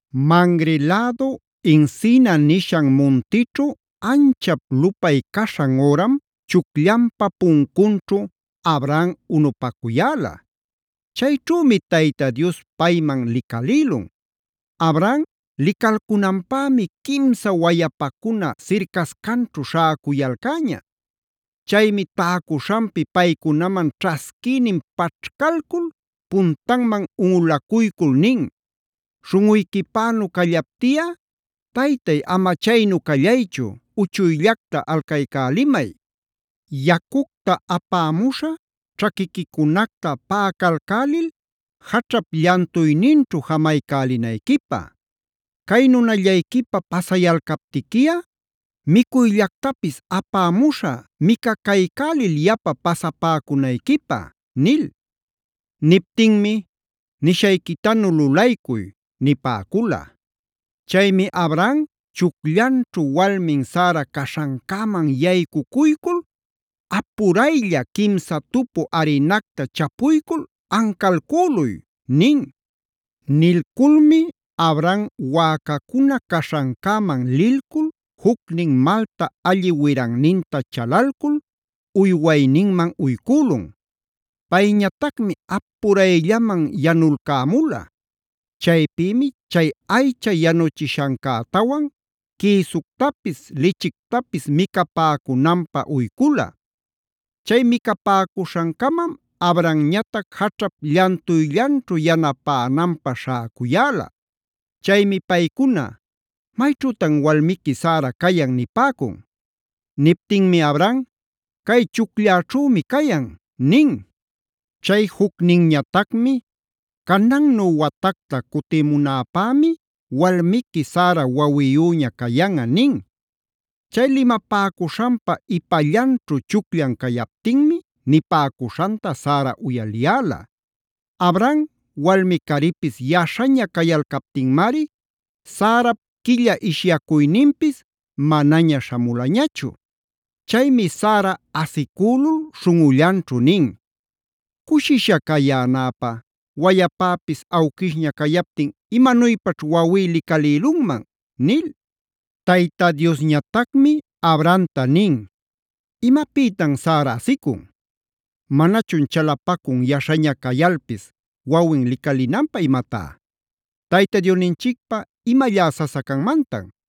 Mamre lädu encina nishan muntićhu anchap lupay caśhan üram chucllanpa puncunćhu Abraham unupacuyäla. Chayćhümi Tayta Dios payman licalïlun. Abraham licalcunanpämi quimsa wayapacuna sircascanćhu śhäcuyalcäña.a Chaymi täcuśhanpi paycunaman ćhasquïnin paćhcalcul, puntanman unꞌulacuycul nin: “Śhunꞌuyquipänu callaptiꞌa, Taytay ama chaynu callayćhu uchuyllacta alcaycälimay. Yacucta apämuśhä ćhaquiquicunacta paꞌacalcälil jaćhap llantuyninćhu jamaycälinayquipä. Cay nunallayquipa pasayalcaptiquiꞌa micuyllactapis apämuśhä micacaycälil yapa pasapäcunayquipä” nil. Niptinmi: “Nishayquitanu lulaycuy” nipäcula. Chaymi Abraham chucllanćhu walmin Sara caśhancäman yaycucuycul: “Apuraylla quimsa tupu arinacta chapuycul ancalcüluy” nin. Nilculmi Abraham wäcacuna caśhancäman lilcul jucnin malta alli wiranninta chalalcul uywayninman uycülun. Payñatacmi apurayllaman yanulcämula. Chaypïmi chay aycha yanuchishancätawan quïsuctapis, lichictapis micapäcunanpä uycula. Chay micapäcuśhancamam Abrahamñatac jaćhap llantuyllanćhu yanapänanpä śhäcuyäla. Chaymi paycuna: “¿Mayćhütan walmiqui Sara cayan?” nipäcun. Niptinmi Abraham: “Cay chuclläćhümi cayan” nin. Chay jucninñatacmi: “Canannü watacta cutimunäpämi walmiqui Sara wawiyüña cayanꞌa” nin.b Chay limapäcuśhanpa ipallanćhu chucllan cayaptinmi nipäcuśhanta Sara uyaliyäla. Abraham walmi-caripis yaśhaña cayalcaptinmari Sarap quilla ishyacuyninpis manaña śhamulañachu. Chaymi Sara asicülul śhunꞌullanćhu nin: “¿Cushisha cayänäpä wayapäpis awquishña cayaptin imanuypaćh wawí licalïlunman?”c nil. Tayta Diosñatacmi Abrahamta nin: “¿Imapïtam Sara asicun? ¡Manachun chalapacun yaśhaña cayalpis wawin licalinanpä imatá! ¿Tayta Diosninchicpä, imallá sasa canmantan?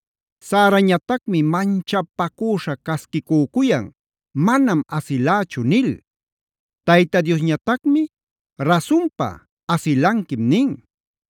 Sarañatacmi manchapacüśha casquicücuyan: “Manam asilächu” nil. Tayta Diosñatacmi: “Rasunpa, asilanquim” nin.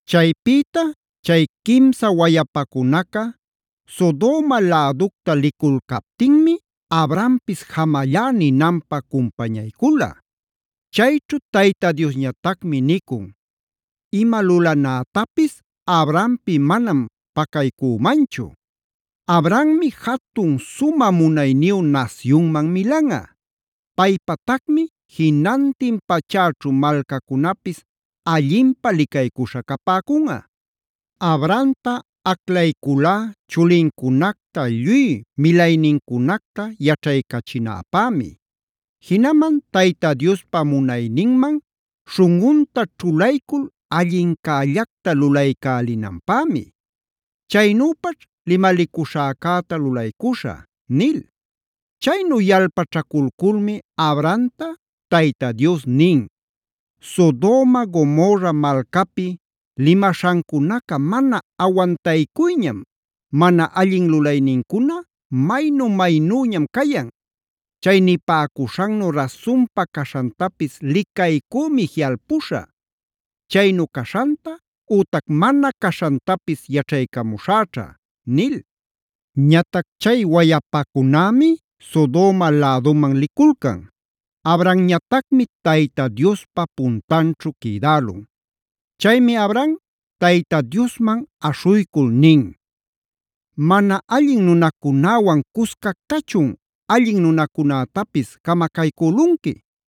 Chaypïta chay quimsa wayapacunaca Sodoma läducta liculcaptinmi Abrahampis jamallá ninanpä cumpañaycula. Chayćhu Tayta Diosñatacmi nicun: “Ima lulanätapis Abrahampi manam pacaycümanchu. Abrahammi jatun sumä munayniyu nasyunman milanꞌa. Paypatacmi jinantin pachäćhu malcacunapis allinpä licaycuśhä capäcunꞌa. Abrahamta aclayculá chulincunacta lluy milaynincunacta yaćhaycachinäpämi. Jinaman Tayta Diospa munayninman śhunꞌunta ćhulaycul allincällacta lulaycälinanpämi. Chaynüpaćh limalicuśhäcäta lulaycuśhä” nil. Chaynu yalpaćhaculculmi Abrahamta Tayta Dios nin: “Sodoma Gomorra malcapi limaśhancunaca mana awantaycuyñam; mana allin lulaynincuna maynu-maynüñam cayan. Chay nipäcuśhannu rasunpa caśhantapis licaycümi jiꞌalpuśhä. Chaynu caśhanta ütac mana caśhantapis yaćhaycamuśhäćha” nil. Ñatac chay wayapacunämi Sodoma läduman liculcan; Abrahamñatacmi Tayta Diospa puntanćhu quïdälun. Chaymi Abraham Tayta Diosman aśhuycul nin: “¿Mana allin nunacunäwan cuscactachun allin nunacunätapis camacaycülunqui?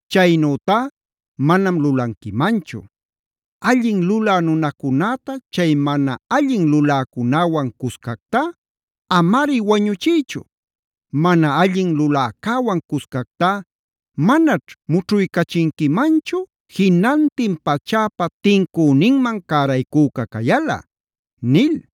Chaynütá manam lulanquimanchu. ¡Allin lulä nunacunäta chay mana allin luläcunäwan cuscactá amari wañuchiychu! ¡Mana allin luläcäwan cuscactá manaćh mućhuycachinquimanchu jinantin pachäpa tincüninman caraycüca cayalꞌa!” nil.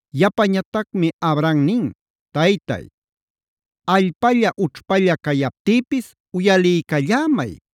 Yapañatacmi Abraham nin: “Taytay, allpalla ućhpalla cayaptïpis uyaliycallämay,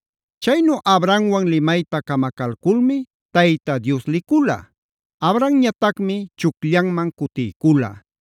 Chaynu Abrahamwan limayta camacalculmi Tayta Dios licula. Abrahamñatacmi chucllanman cutiycula.